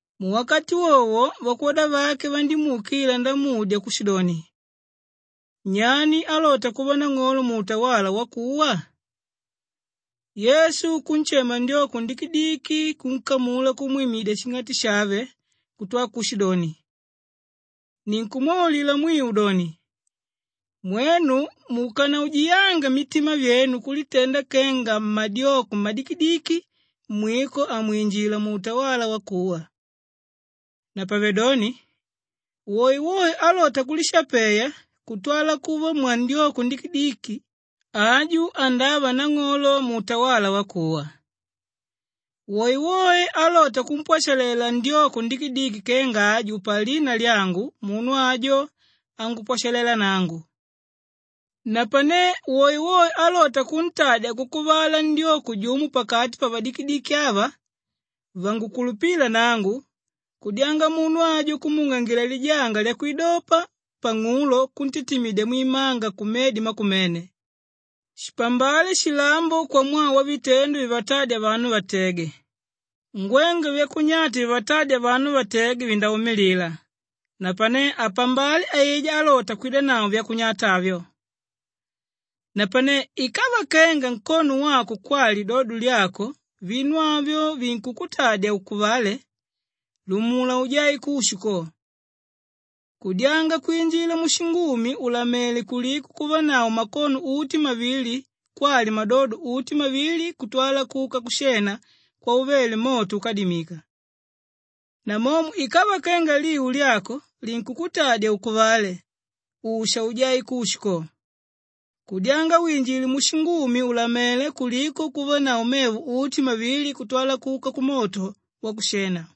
Muwakati wowo vakwoda vake vandímuukila ndamudya kushidoni, “Nyani álota kuva nang'olo muutawala wakuwa?” Yesu kunshema ndyoko ndikidiki, kunkamula kumwimidya shing'ati shave kutwala kushidoni, “Ninkumwaulila mwiu doni, mwenu mukanaujiyanga mitima vyenu kulitenda kenga mmadyoko mmadikidiki, mwiko hamwinjila muutawala wakuwa. Napavedoni woewoe álota kulishapeya kutwala kuva mwandyoko ndikidiki, aju andava nang'olo muutawala wakuwa. Woewoe álota kumpwashalela ndyoko ndikidiki kenga aju palina lyangu munu ajo angupwashalela nangu. Napane woewoe álota kuntadya kukuvala ndyoko jumo pakati pavadikidiki ava vangukulupíla nangu, kudyanga munu ajo kumuungangila lijanga lyakwidopa pang'ulo kuntitimidya mwimanga kumedi makumene. Shipambale shilambo kwamwaa wavitendo vivatádya vanu vatege. Ngwengwe vyakunyata vivatádya vanu vatege vindaumilila napane apambale aijá álota kwidanavo vyakunyata avyo! “Napanelo ikava kenga nkono wako kwali lidodo lyako vinu avyo vinkukutadya ukuvale, lumula ujae kushu ko. Kudyanga kwinjila mushingumi ùlamele kuliko kuvanavo makono uti mavili kwali madodo uti mavili kutwala kuka kushena kwauvele moto úkamalilika. Namomo ikava kenga liu lyako linkukutadya ukuvale usha ujae kushu ko, kudyanga winjile mushingumi ùlamele kuliko kuvanavo mevo uti mavili kutwala kuka kumoto wakushena.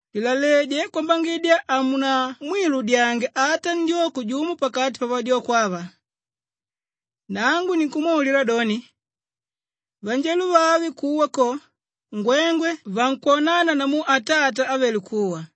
“Lilaledye kwambangidya hamunamwiludyange ata ndyoko jumo pakati pavadyoko ava! Nangu ninkumwaulila doni, vanjelo vave kuwa ko, ngwengwe vankwonana namu Atata ávele kuwa.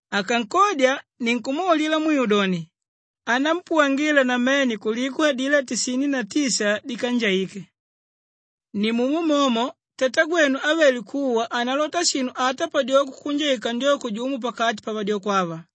Akankodya, ninkumwaulila mwiu doni, anampuwangila namene kuliko adilá tisini na tisa dikanjaíke. Nimumo momo Tatagwenu ávele kuwa hanalota shinu ata padyoko kunjaika ndyoko jumo pakati pavadyoko ava.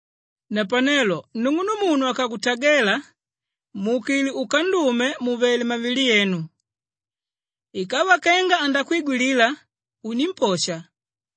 “Napanelo nung'unumunu akakutagela muukile ukandume mùvele mmavili yenu. Ikava kenga andakwigwilila, unimposha.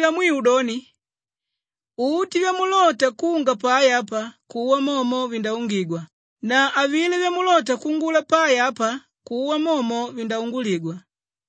Ninkumwaulila mwiu doni, uti vyamulota kunga pai apa, kuwa momo vindaungigwa na avilá vyamulota kuungula pai apa, kuwa momo vindaunguligwa.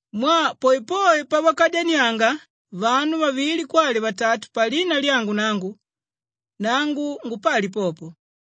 Mwaa poepoe pavakadyanianga vanu vavili kwali vatatu palina lyangu nangu, nangu ngupali popo.”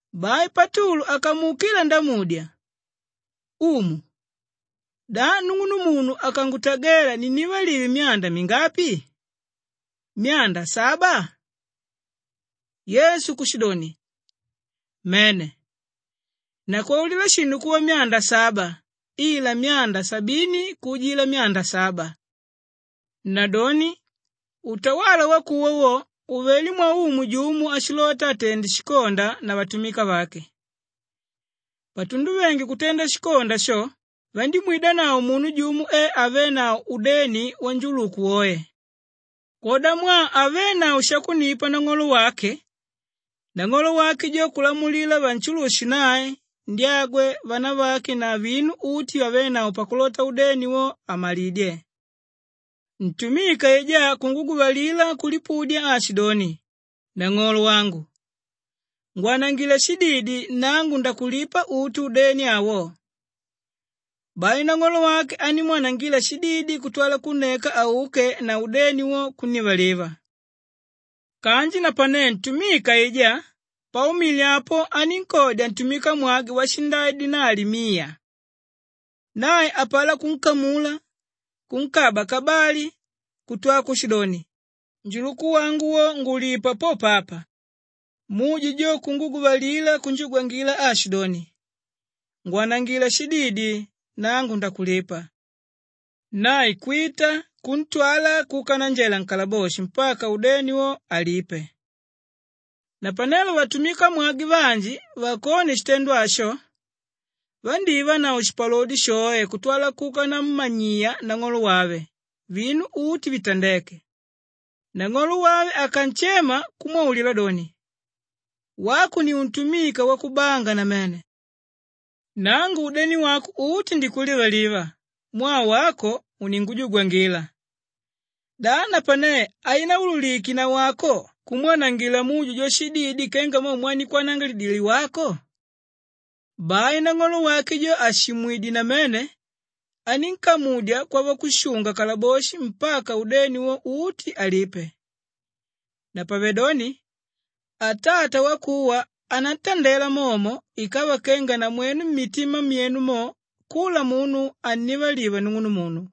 Bai Patulu akamuukila ndamudya, “Umu, da nung'unumunu akangutagela ninnivalive myanda mingapi? Myanda saba?” Yesu kushidoni, “Mene, nakwaulila shinu kuva myanda saba ila myanda sabini kuujila myanda saba. Nadoni utawala wakuwa wo uvelé mwaumu jumo áshilota atende shikonda na vatumika vake. Patunduvenge kutenda shikonda sho, vandímwidanavo munu jumo e avénavo udeni wanjuluku woe. Kwodamwaa havenavo shakunnipa nang'olo wake, nang'olo wake jo kulamulila vanshulushe nae, ndyagwe, vanavake na vinu uti vyavénavo pakulota udeni wo, amalidye. Ntumika aijá kunguguvalila kulipudya aashidoni, ‘Nang'olo wangu ngwanangila shididi nangu ndakulipa uti udeni awo.’ Bai nang'olo wake andímwanangila shididi kutwala kunneka auke na udeni wo, kunnivaliva. “Kanji napane ntumika aijá paumile apo anínkodya ntumikamwagwe washindai dinali miya. Nae apalá kunkamula, kunkaba kabali kutwa kushidoni, ‘Njuluku wangu wo, ngulipa popo apa!’ Muje jo kunguguvalila kunjugwangila aashidoni, ‘Ngwanangila shididi, nangu ndakulipa.’ Nae kwita kuntwala kuka nanjela nkalaboshi mpaka udeni wo, alipe. Napanelo vatumikamwagwe vanji vakone shitendo asho, vandívanavo shipalodi shoe kutwala kuka nammanyiya nang'olo wave vinu uti vitandéke. “Nang'olo wave akanshema kumwaulila doni, ‘Wako ni untumika wakubanga namene. Nangu udeni wako uti ndikulivaliva mwaa wako uningujugwangila. Da napane hainaululike nawako kumwanangila mujo jo shididi kenga mo mwandikwanangilidile wako?’ Bai nang'olo wake jo àshimwidye namene anínkamudya kwavakushunga-kalaboshi mpaka udeni wo uti, alipe. Napavedoni Atata wakuwa anantandela momo ikava kenga namwenu mmitima myenu mo, kula munu hannivaliva nung'unumunu.”